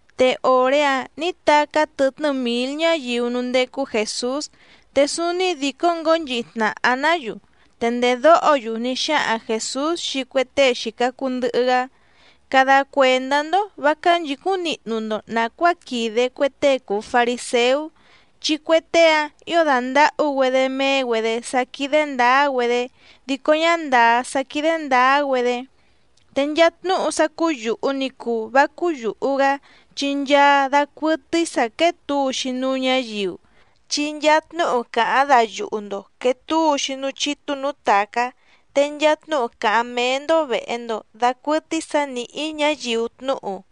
Te òré‑áⁿ nǐ tacá tɨtnɨ́ mǐl ñáyiu núú ndécú Jèsús, te súúní dìcó ngǒnchihi tnàha‑ná‑yu. Te ndèdóho‑yu ní xáhaⁿ Jèsús xii cue tée xìca cuu ndɨhɨ‑gá: —Cada cuèndá‑ndó vǎ cánchǐcúⁿ nihnu‑ndo nàcuáa quìde cue tée cùu fariséú, chi cue tée‑áⁿ ǐo dàndahú‑güedé méé‑güedě sá quídé ndǎá‑güedé dico ñá ndàá sá quídé ndǎá‑güedé. Te nchaa tnúhu sá cúú yùhu ni cuu vá cúú yùhu‑gá, chi nchaa dacuɨtɨ́í sǎ quéé tǔu‑xi núú ñǎyiu. Chi nchaa tnúhu càháⁿ dayuhu‑ndo quèe túu‑xi núú chítú nǔú tàcá, te nchaa tnúhu càháⁿ méé‑ndó vèhe‑ndo dacuɨtɨ́í sǎ nìhí ñáyiu tnúhu.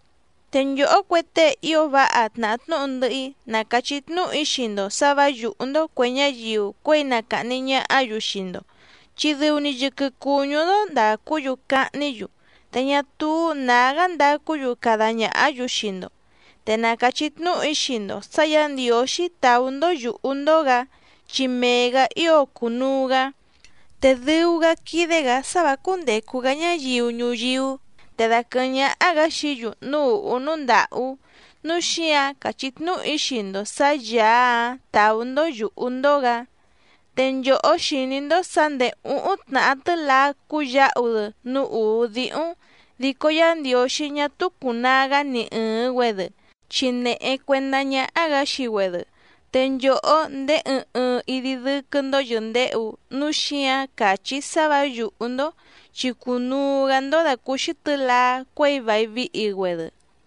’Te nchòhó cue tée ío váha tnàhá tnúhu ndɨhɨ‑í ná càchí tnúhu‑í xii‑ndo sǎ vǎ yùhú‑ndó cuè ñáyiu cuěi na càhni ñahá‑yu xii‑ndo, chi dɨu‑ni yɨquɨ cùñú‑ndó ndàcú‑yu cahní‑yu, te ñá túú nǎgá ndacú‑yu cada ñàhá‑yu xii‑ndo. Te na càchí tnúhu‑í xii‑ndo sǎ Yǎ Ndiǒxí tàú‑ndó yùhú‑ndó‑gǎ, chi mee‑gǎ ío cùnuu‑gá, te dɨu‑gá quídé‑gǎ sá vǎ cúndècu‑gá ñáyiu ñuyíú, te daquɨ̀hɨ́ⁿ ñáhá‑gǎ xií‑yu núú ùhú núú ndàhú, núu xíǎⁿ càchí tnúhu‑í xii‑ndo sǎ Yàá‑áⁿ tàú‑ndó yùhú‑ndó‑gǎ. ’Te nchòhó xìní‑ndó sǎ ndèé úhúⁿ tnàhá tɨ́laá cúyǎhu‑dɨ núú ùú díhúⁿ, dico Yá Ndiǒxí ñá túú cùnaa‑gá ni ɨ̀ɨⁿ‑güedɨ, chi nèhe cuendá ñáhá‑gǎ xii‑güedɨ. Te nchòhó ndéé ɨɨⁿ ɨɨⁿ idi dɨ́quɨ́‑ndó yɨ̀ndehu, núu xíǎⁿ càchí‑í sá vǎ yùhú‑ndó, chi cùnuu‑gá‑ndó dàcúúxí tɨ̌laá cuěi vài vihi‑güedɨ.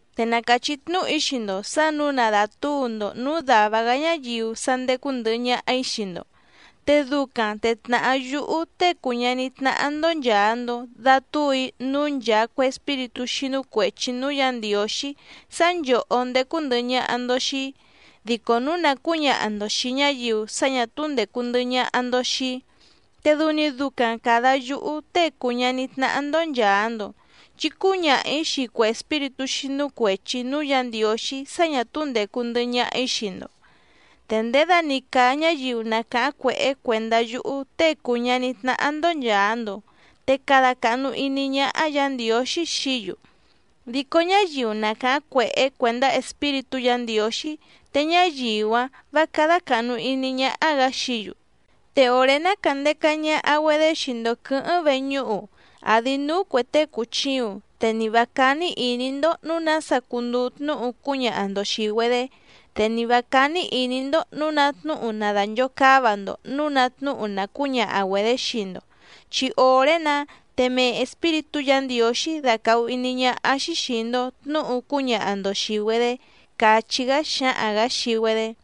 ’Te na càchí tnúhu‑í xii‑ndo sǎ nǔu na dàtúu‑ndo nǔú dàva‑gá ñáyiu sá ndécú ndɨ̀hɨ ñaha‑í xii‑ndo. Te ducaⁿ te tnàhá yúhú Tée cùu ñaní tnáhá‑ndó nchàa‑ndo datúu‑í núú nchàa cue espíritú xínú cuèchi núú Yǎ Ndiǒxí sá nchòhó ndécú ndɨ̀hɨ ñaha‑ndo xii‑í. Dico núu na cǔñaha‑ndo xìi ñáyiu sá ñà túú ndècu ndɨhɨ ñaha‑ndo xii‑í, te dɨu‑ni ducaⁿ càda yúhú Tée cùu ñaní tnáhá‑ndó nchàa‑ndo, chi cúñaha‑ǐ xii cue espíritú xínú cuèchi núú Yǎ Ndiǒxí sá ñà túú ndècu ndɨhɨ ñaha‑í xii‑ndo. ’Te ndědani càa ñáyiu na càháⁿ cuèhé cuèndá yúhú Tée cùu ñaní tnáhá‑ndó nchàa‑ndo, te cada càhnu iní ñáhá Yǎ Ndiǒxí xií‑yu. Dico ñáyiu na càháⁿ cuèhé cuèndá Espíritú Yǎ Ndiǒxí, te ñáyiu‑áⁿ vǎ cádá càhnu iní ñáhá‑gǎ xií‑yu. ’Te òré ná càndeca ñaha‑güedé xii‑ndo quɨ̌hɨ́ⁿ veñúhu, àdi núú cuè tée cùchiuⁿ, te ni vǎ cání ìní‑ndó nǔu nása cunduu tnúhu cúñaha‑ndo xìi‑güedé, te ni vǎ cání ìní‑ndó nǔu ná tnúhu nadànchocáva‑ndo nǔu ná tnúhu na cǔñaha‑güedě xii‑ndo, chi òré‑nǎ te mee Espíritú Yǎ Ndiǒxí dacàhu iní ñáhá‑xí xìi‑ndo tnúhu cúñaha‑ndo xìi‑güedé —càchí‑gá xáhaⁿ‑gǎ xii‑güedé.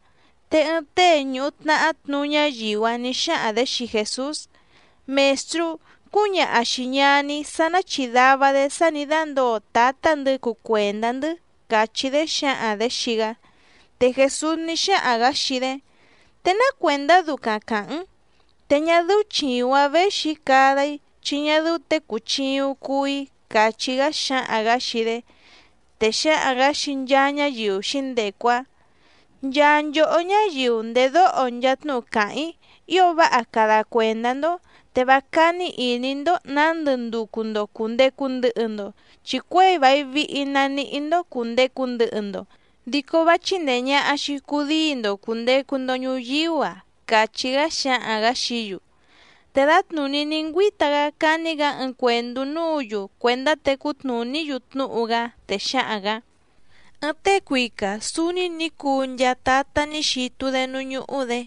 Te ɨɨⁿ tée ñùhu tnahá tnuú ñáyiu‑áⁿ nǐ xáhaⁿ‑dě xii Jèsús: —Mèstrú, cúñaha xìi ñaní‑í sá ná chìdava‑dé sá nǐ dándǒo tǎtá‑ndɨ̌ cuu cuèndá‑ndɨ́ —càchí‑dé xǎhaⁿ‑dě xii‑gá. Te Jèsús ní xáhaⁿ‑gǎ xii‑dé: —¿Te ná cuèndá ducaⁿ càháⁿ‑n? Te ñá dɨ́ú chìuⁿ‑áⁿ věxi‑í cada‑í, chi ñá dɨ́ú těe cùchiuⁿ cuu‑í —càchí‑gá xáhaⁿ‑gǎ xii‑dé. Te xáhaⁿ‑gǎ xii nchaa ñáyiu xǐndecu‑áⁿ: —Nchaa nchòhó ñáyiu ndèdóho nchaa tnúhu càháⁿ‑í ío váha cada cuèndá‑ndó, te vá cání ìní‑ndó nǎndɨ nducu‑ndo cùndecu ndɨhɨ‑ndo, chi cuěi vài vihi na nihí‑ndó cùndecu ndɨhɨ‑ndo, dico vá chíndèe ñaha‑xi cudíi‑ndo cùndecu‑ndo ñuyíú‑a —càchí‑gá xáhaⁿ‑gǎ xií‑yu. Te dǎtnùní ní ngüíta‑gá cání‑gǎ ɨɨⁿ cuèndú núǔ‑yu cuèndá tecú tnùní‑yu tnúhu‑gá, te xáhaⁿ‑gǎ: —Ɨɨⁿ tée cuica sǔúní nǐ cuu nchaa tatá ní xitu‑dé núú ñúhú‑dě.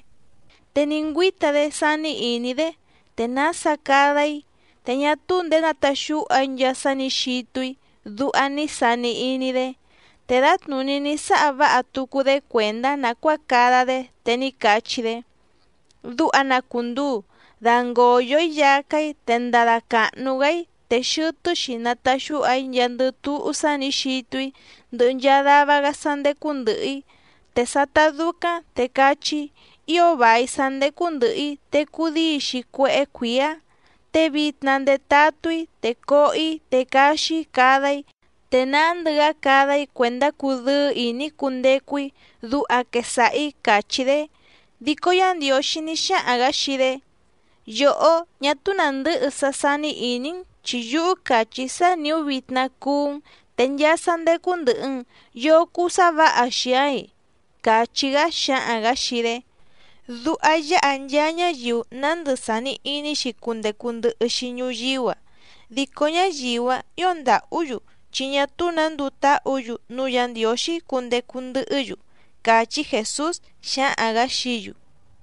Te ní ngüíta‑dé sání ìní‑dé: “¿Te nása cada‑í? Te ñá túú ndèé nataxúha‑í nchaa sá nǐ xitu‑í”, duha ní sani iní‑dé. Te dǎtnùní ní sáha váha tucu‑dé cuèndá nàcuáa cada‑dé, te ní cachí‑dé: “Duha na cùnduu, dangòyo‑í yacá‑í, te ndada càhnu‑gá‑í, te xɨtɨ́‑xi nataxúha‑í nchaandɨ túhú sá nǐ xitu‑í, ndɨhɨ nchaa dava‑gá sá ndécú ndɨ̀hɨ‑í. Te sátá dúcáⁿ, te cachí‑í: Ío vài sá ndécú ndɨ̀hɨ‑í, te cudíi‑xi cuéhé cuǐá, te vitna ndetatú‑í, te coho‑í te caxi‑í cada‑í, te nándɨ‑gá cada‑í cuèndá cudɨ́ɨ́ ìní‑í cundecu‑í, duha quesaha‑ǐ”, càchí‑dé. Dico Yá Ndiǒxí ní xáhaⁿ‑gǎ xii‑dé: “Yòhó, ñá túú nàndɨ́hɨ sá sání ìní‑n, chi yúhú càchí‑í sá nìú vitna cuú‑n, te nchaa sá ndécú ndɨ̀hɨ‑n ¿yoo cuu sá vǎha xii‑aⁿ‑i?”, càchí‑gá xáhaⁿ‑gǎ xii‑dé. Duha yáha nchaa ñáyiu nándɨ sàni iní‑xi cundecu ndɨhɨ́‑xi ñuyíú‑a, dico ñáyiu‑áⁿ ǐo ndàhú‑yu chi ñá túú nǎ nduu táhǔ‑yu núú Yǎ Ndiǒxí cundecu ndɨhɨ́‑yu —càchí Jèsús xáhaⁿ‑gǎ xií‑yu.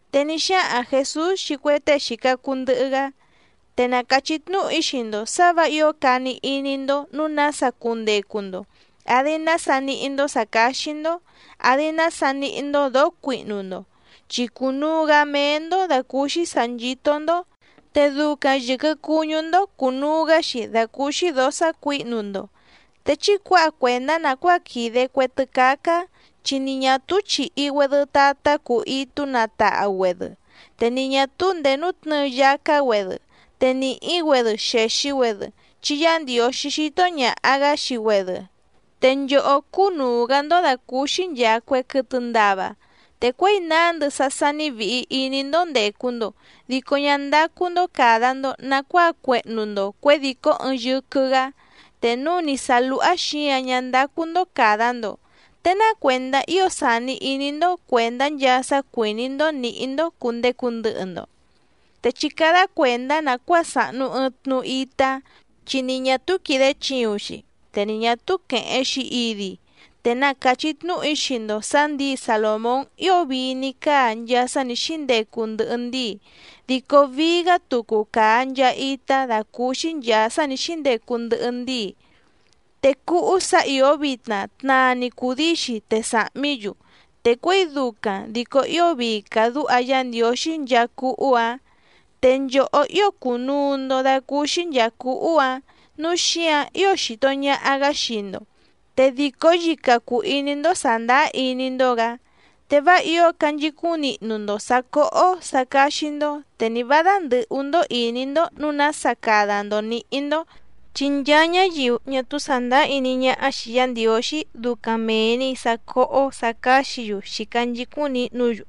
Te ní xáhaⁿ Jèsús xii cue tée xìca cuu ndɨhɨ‑gá: —Te na càchí tnúhu‑í xii‑ndo sǎ vǎ ǐo cani iní‑ndó nǔu nása cundecu‑ndo, àdi nása níhí‑ndó sǎ cáxí‑ndó, àdi nása níhí‑ndó dǒó cuihnu‑ndo. Chi cùnuu‑gá méé‑ndó dàcúúxí sǎ nchító‑ndó, te ducaⁿ yɨ̀quɨ cuñú‑ndó cùnuu‑gá‑xi dàcúúxí dǒó sácuǐhnu‑ndo. Te chí cuǎha cuèndá nàcuáa quìde cue tɨ́cácá, chi ni ñà túú chìhi‑güedɨ tatá cuu itú natahu‑güèdɨ te ni ñà túú ndèé nútnɨ̌ɨ yacá‑güedɨ, te nìhí‑güedɨ xèxi‑güedɨ, chi Yá Ndiǒxí xító ñàha‑gá xii‑güedɨ. ¡Te nchòhó cúnùu‑gá‑ndó dàcúúxí nchàa cue quɨtɨ ndava! Te cuěi nándɨ sá sání vìhi iní‑ndó ndècu‑ndo, dico ñá ndácú‑ndó càda‑ndo nacuáa cuehnu‑ndo cuědìcó ɨɨⁿ yɨquɨ‑gǎ. Te núu ni sǎ lúhá xǐǎⁿ ñá ndácú‑ndó càda‑ndo, ¿te ná cuèndá ío sàni iní‑ndó cuèndá nchaa sá cuìní‑ndó nǐhí‑ndó cùndecu ndɨhɨ‑ndo? ’Te chí cádá cuèndá nàcuáa sàhnu ɨɨⁿ tnu itá, chi ni ñà túú quìde chiuⁿ‑xi, te ni ñà túú quèheⁿ‑xi idi. Te na càchí tnúhu‑í xii‑ndo sǎ ndǐi Salòmón ío vii ní cáa nchaa sá nǐ xíndecu ndɨhɨ ndíi, dico vií‑gá tucu càa nchaa itá dàcúúxí nchàa sá nǐ xíndecu ndɨhɨ ndíi. Te cúhú sǎ ìó vitna tnaa‑ni cùdíi‑xi te sàhmí‑yu, te cuěi ducaⁿ dico ío vii càdúha Yá Ndiǒxí nchaa cúhú‑ǎⁿ. ¡Te nchòhó ío cùnuu‑ndo dacúúxí nchàa cúhú‑ǎⁿ, núu xíǎⁿ ío xìto ñaha‑gá xii‑ndo, te dìcó yica cùu iní‑ndó sàndáá iní‑ndó‑gǎ! Te vá ǐo canchicúⁿ nihnu‑ndo sǎ cóhó sǎ cáxí‑ndó, te ni vǎ dándɨ̀hú‑ndó ìní‑ndó nǔu nása cada‑ndo nǐhí‑ndó. Chi nchaa ñáyiu ñá túú sàndáá iní ñáhá xìi Yá Ndiǒxí ducaⁿ mèe‑ni sá cóhó sǎ cáxǐ‑yu xìca nchicúⁿ nihnú‑yu.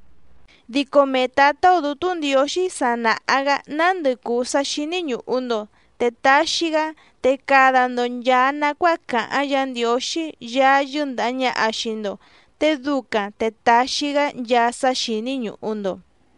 Dico mee Tǎtá‑ó Dǔtú Ndiǒxí sa nàha‑gá nándɨ cùu sá xíní ñùhu‑ndo, te taxi‑gá. Te cada‑ndo nchàa nacuáa càháⁿ Yǎ Ndiǒxí Yaá yɨ́ndàha ñaha xii‑ndo, te ducaⁿ te taxi‑gá nchaa sá xíní ñùhu‑ndo.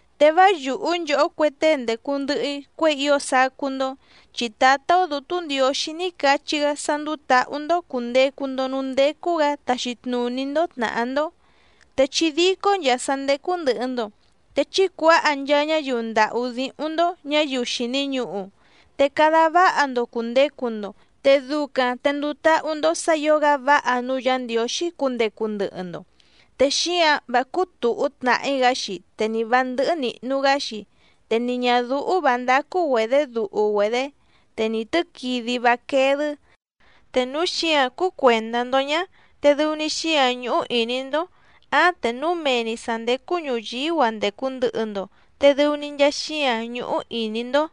’Te vá yùhú nchòhó cue tée ndècu ndɨhɨ‑í cuěi ío sacú‑ndó, chi Tǎtá‑ó Dǔtú Ndiǒxí ní cachí‑gá sá ndúú tǎhú‑ndó cùndecu‑ndo núú ndécú‑gǎ taxi tnùní‑ndó tnàhá‑ndó. Te chí dícó nchàa sá ndécú ndɨ̀hɨ‑ndo, te chí cuǎha nchaa ñáyiu ndàhú díhúⁿ‑ndó ñǎyiu xìni ñuhu, te cada váha‑ndo cùndecu‑ndo, te ducaⁿ te nduu táhú‑ndó sǎ ǐo‑gá váha núú Yǎ Ndiǒxí cundecu ndɨhɨ‑ndo, te xíǎⁿ vá cúú tùhú tnàhí‑gá‑xi, te ni vǎ ndɨ́hɨ́ nìhnu‑gá‑xi, te ni ñàdúhú vǎ ndácú‑güedě duhu‑güedě, te ni tɨ̌quidi vá quéé‑dɨ́. Te núu xíǎⁿ cúú cuèndá‑ndó ñá, te dɨu‑ni xíǎⁿ ñúhú ìní‑ndó, áⁿ te núu mee‑ni sǎ ndécú ñùyíú‑a ndècu ndɨhɨ‑ndo, te dɨu‑ni nchaa xíǎⁿ ñúhú ìní‑ndó.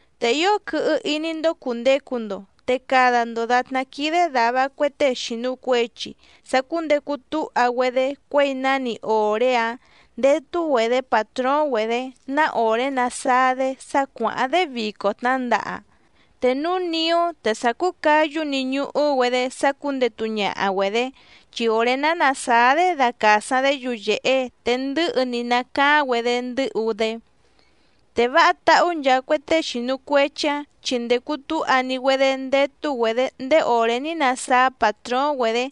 ’Te ío quɨhɨ iní‑ndó cùndecu‑ndo, te cada‑ndo dàtná quídé dàva cue tée xìnu cuechi sacúndecu túha‑güedé cuěi náni òré‑áⁿ ndétú‑güedě pàtróóⁿ‑güedě ná òré nasáá‑dé sá cuàháⁿ‑dé vico tnǎndaha. Te núu niú te sa cúu cáyú‑ni ñuhú‑güedé sá cúndètu ñaha‑güedé, chi òré ná nàsáá‑dé dacàsaⁿ‑dé yuyèhe, te ndɨ̌hɨ‑ni nacaáⁿ‑güedé ndɨ́hu‑dé. Te váha táhú nchaa cue tée xìnu cuechi‑áⁿ, chi ndècu túha‑ni‑güedé ndétú‑güedě ndéé òré ní nasáá pàtróóⁿ‑güedě,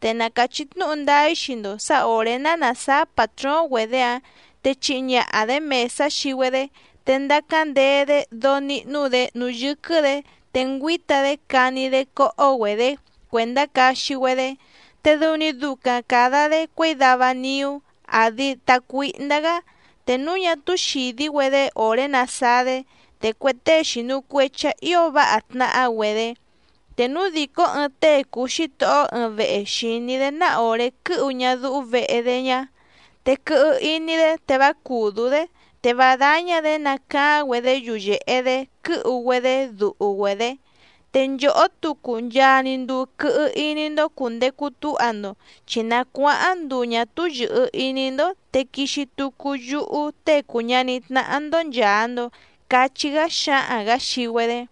te na càchí tnúhu ndáá‑í xii‑ndo sǎ òré ná nàsáá pàtróóⁿ‑güedě‑áⁿ te chihi ñaha‑dě mèsá xii‑güedé, te ndacáⁿ ndee‑dé dóó níhnú‑dě núú yɨ́quɨ́‑dě, te ngüíta‑dé cani‑dé cóhó‑güedě cuèndá caxi‑güedé. Te dɨu‑ni ducaⁿ càda‑dé cuěi dava niú, àdi tacuíhndá‑gá, te núu ñá túú xìdí‑güedé òré nasáá‑dé, te cue tée xìnu cuechi‑áⁿ ǐo váha tnahá‑güedé. Te núu dìcó ɨɨⁿ tée cùu xítohó ɨɨⁿ vehe xìní‑dé ná òré quɨ́hu ñadúhú vehe‑dé ñá, te quɨhɨ iní‑dé te vá cùdú‑dé, te vá dáñá‑dě nacaáⁿ‑güedé yuyèhe‑dé quɨ́hu‑güedé duhu‑güedě. Te nchòhó tucu nchaa‑ni nduu quɨhɨ iní‑ndó cùndecu túha‑ndo, chi na cuáháⁿ nduu ñǎ túú yɨ̀hɨ iní‑ndó, te quixi tucu yúhú Tée cùu ñaní tnáhá‑ndó nchàa‑ndo —cachí‑gá xáhaⁿ‑gǎ xii‑güedé.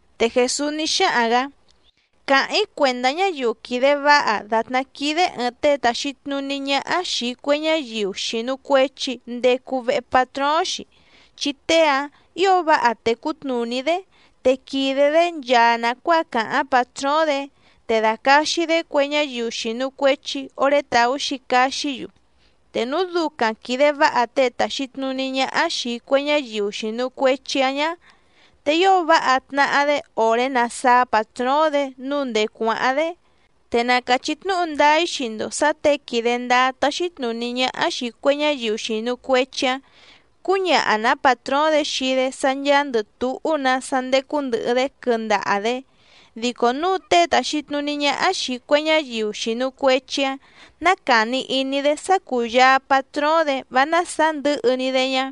Te Jèsús ní xáhaⁿ‑gǎ: —Càháⁿ‑í cuèndá ñáyiu quìde váha dàtná quídé ɨ̀ɨⁿ tée tàxi tnuní ñáhá xìi cue ñáyiu xìnu cuechi ndecu vehe patróóⁿ‑xi, chi tée‑áⁿ ǐo váha tècú tnùní‑dé, te quìde‑dé nchaa nàcuáa càháⁿ pàtróóⁿ‑dě, te dàcaxi‑dé cue ñáyiu xìnu cuechi oré tàú‑xi caxí‑yu. Te núu ducaⁿ quìde váha tée tàxi tnuní ñáhá xìi cue ñáyiu xìnu cuechi‑áⁿ ñá, te ío váha tnàhá‑dé òré násǎá pàtróóⁿ‑dě nǔu ndèé cuáháⁿ‑dé. Te na càchí tnúhu ndáá‑í xii‑ndo sǎ těe quìde ndáá táxí tnùní ñáhá xìi cue ñáyiu xìnu cuechi‑áⁿ cǔñaha‑nǎ pàtróóⁿ‑dě xii‑dé sá ncháándɨ̀ túhú‑nǎ sá ndécú ndɨ̀hɨ‑dé quɨndaha‑dě. Dico núu tée tàxi tnuní ñáhá xìi cue ñáyiu xìnu cuechi‑áⁿ ná càni iní‑dé sá cúyàa patróóⁿ‑dě vá násàá ndɨ̌hɨ‑ni‑dé ñá,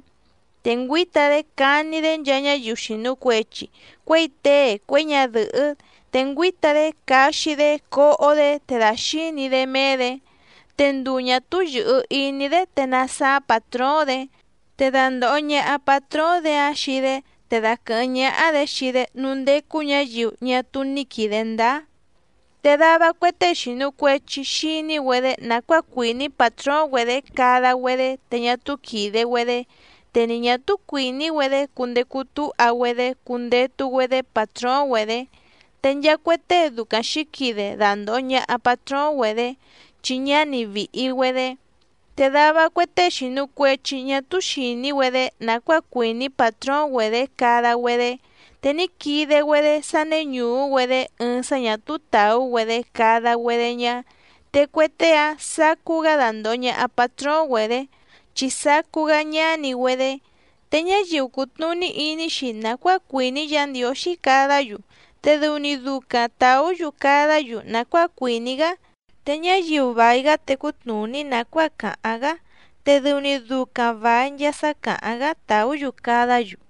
te ngüíta‑dé cani‑dé nchaa ñáyiu xìnu cuechi, cuěi tée cuěi ñadɨ̀hɨ́, te ngüíta‑dé caxi‑dé coho‑dé, te dàxíni‑dé méé‑dě, te nduu ñà túú yɨ̀hɨ iní‑dé te nasáá pàtróóⁿ‑dě, te dandòho ñaha patróóⁿ‑dě‑áⁿ xii‑dé, te daquɨ̀hɨ́ⁿ ñáhá‑dě xii‑dé núú ndécú ñǎyiu ñá túú ní quìde ndáá. ’Te dava cue tée xìnu cuechi xiní‑güedé nàcuáa cuìní pàtróóⁿ‑güedě cada‑güedé te ñá túú quìde‑güedé, te ni ñà túú cuìní‑güedé cundecu túha‑güedé cundetu‑güedé pàtróóⁿ‑güedě, te nchaa cue tée ducaⁿ xǐquide dandòho ñaha patróóⁿ‑güedě, chi ñáni vìhi‑güedé. Te dava cue tée xìnu cuechi ñá túú xìní‑güedé nàcuáa cuìní pàtróóⁿ‑güedě cada‑güedé, te ní quide‑güedé sá néñùú‑güedé ɨɨⁿ sá ñà túú tàú‑güedé cada‑güedé ñá, te cue tée‑áⁿ sacú‑gá dandòho ñaha patróóⁿ‑güedě, chi sacú‑gá ñáni‑güedé. Te ñáyiu cùtnuní iní‑xi nàcuáa cuìní Yǎ Ndiǒxí cadá‑yu, te dɨu‑ni ducaⁿ tàú‑yu cadá‑yu nàcuáa cuìní‑gá. Te ñáyiu vài‑gá tècú tnùní nàcuáa càháⁿ‑gá, te dɨu‑ni ducaⁿ vài nchaa sá càháⁿ‑gá tàú‑yu cadá‑yu.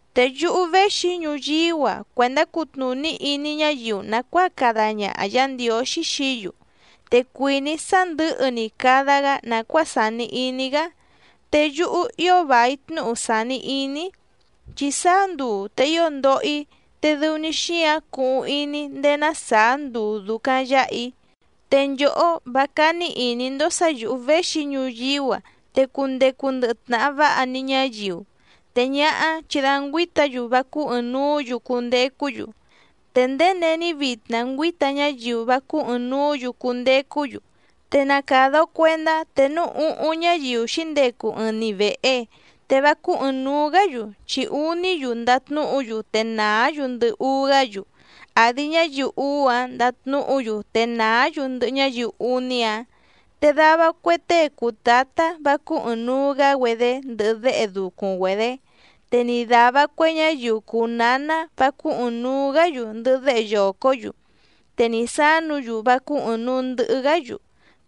’Te yúhú véxi‑í ñuyíú‑a cuèndá cutnùní iní ñáyiu nàcuáa cada ñaha Yǎ Ndiǒxí xií‑yu, ¡te cuìní‑í sá ndɨ̌hɨ‑ni cada‑gá nàcuáa sàni iní‑gá! Te yúhú ío vài tnúhu sàni iní‑í, ¡chi sáá nduu te ío ndoho‑í, te dɨu‑ni xíǎⁿ cuhuⁿ iní‑í ndéé ná sàá nduu dùcaⁿ yáha‑í! Te nchòhó vá cání ìní‑ndó sǎ yǔhú véxi‑í ñuyíú‑a te cundecu ndɨhɨ tnàha váha‑ni ñáyiu, te ñáhá chi da ngüíta‑yu vá cúú ɨ̀ɨⁿnuú‑yu cundecú‑yu. Te ndéé není vitna ngüíta ñáyiu vá cúú ɨ̀ɨⁿnuú‑yu cundecú‑yu, te na càda‑o cuendá te núu úhúⁿ ñáyiu xǐndecu ɨɨⁿ‑ni vèhe, te vá cúú ɨ̀ɨⁿnuu‑gá‑yu, chi úní‑yu ndatnúhu‑yu te nàá‑yu ndɨhɨ úú‑gá‑yu, àdi ñáyiu úú‑áⁿ ndatnúhu‑yu te nàá‑yu ndɨhɨ ñáyiu úní‑áⁿ. Te dava cue tée cùu tátá vá cúú ɨ̀ɨⁿnuu‑gá‑güedé ndɨhɨ déhe ducuⁿ‑güedé, te ni dàva cue ñáyiu cùu náná vá cúú ɨ̀ɨⁿnuu‑gá‑yu ndɨhɨ déhe yòcó‑yu, te ni sǎnu‑yu vá cúú ɨ̀ɨⁿnuu ndɨhɨ‑gá‑yu.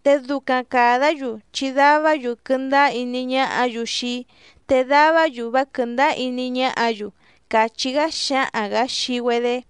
Te ducaⁿ càdá‑yu chi davá‑yu quɨndáá iní ñáhǎ‑yu xii‑í, te davá‑yu vá quɨ̀ndáá iní ñáhǎ‑yu —càchí‑gá xáhaⁿ‑gǎ xii‑güedé.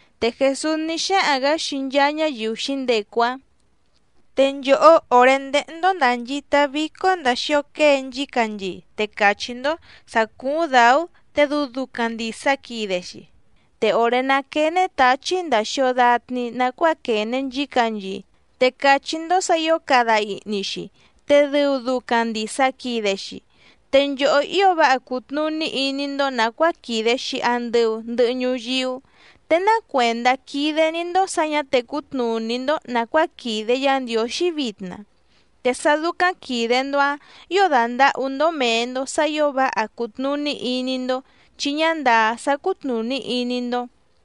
Te Jèsús ní xáhaⁿ‑gǎ xii nchaa ñáyiu xǐndecu‑áⁿ: —Te nchòhó òré ndéhé‑ndó ndànchita vícó ndàa xio quée nchícanchii, te càchí‑ndó sǎ cúúⁿ dǎú, te dɨu ducaⁿ ndìsa quide‑xi. Te òré ná quène táchí ndàa xio datni nacuáa quène nchícanchii, te càchí‑ndó sǎ ǐo cada ihni‑xi, te dɨu ducaⁿ ndìsa quide‑xi. Te nchòhó ío váha cùtnuní iní‑ndó nàcuáa quìde‑xi andɨu ndɨhɨ ñuyíú, ¿te ná cuèndá quídé‑ní‑ndó sǎ ñǎ tècú tnùní‑ndó nàcuáa quìde Yá Ndiǒxí vitna? Te sá dúcáⁿ quìde‑ndo‑áⁿ ǐo dàndahú‑ndó mèe‑ndo sá ǐo váha cùtnuní iní‑ndó, chi ñá ndàá sá cútnùní iní‑ndó.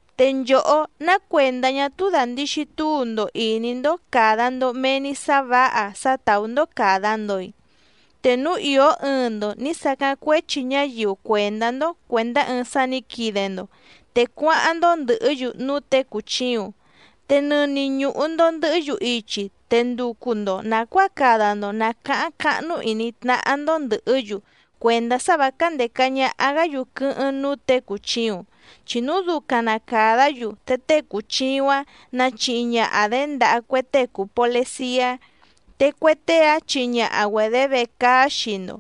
’Te nchòhó, ¿ná cuèndá ñá túú dàndixi túu‑ndo ìní‑ndó càda‑ndo mee‑ni sá vǎha sá tàú‑ndó càda‑ndo‑i? Te núu ìó ɨɨⁿ‑ndo nǐ sacáⁿ cuéchi ñáyiu cuèndá‑ndó cuèndá ɨɨⁿ sá nǐ quide‑ndo, te cuáháⁿ‑ndó ndɨ̀hɨ́‑yu núú těe cùchiuⁿ, te nɨni ñùhu‑ndo ndɨhɨ́‑yu ichi, te nducu‑ndo nàcuáa cada‑ndo nàcáháⁿ cáhnú ìní tnáhá‑ndó ndɨ̀hɨ́‑yu cuèndá sá vǎ cándèca ñaha‑gá‑yu quɨ́hɨ́ⁿ núú těe cùchiuⁿ, chi núu ducaⁿ na càdá‑yu te tée cùchiuⁿ‑áⁿ nachihi ñaha‑dě ndaha cue tée cùu poleciá, te cue tée‑áⁿ chihi ñaha‑güedě vecaá xii‑ndo.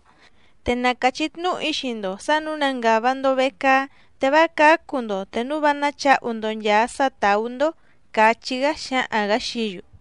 Te na càchí tnúhu‑í xii‑ndo sǎ nǔu na ngàva‑ndo vecaá, te vá cǎcu‑ndo te núu vá náchǎhu‑ndo nchàa sá tàú‑ndó —càchí‑gá xáhaⁿ‑gǎ xií‑yu.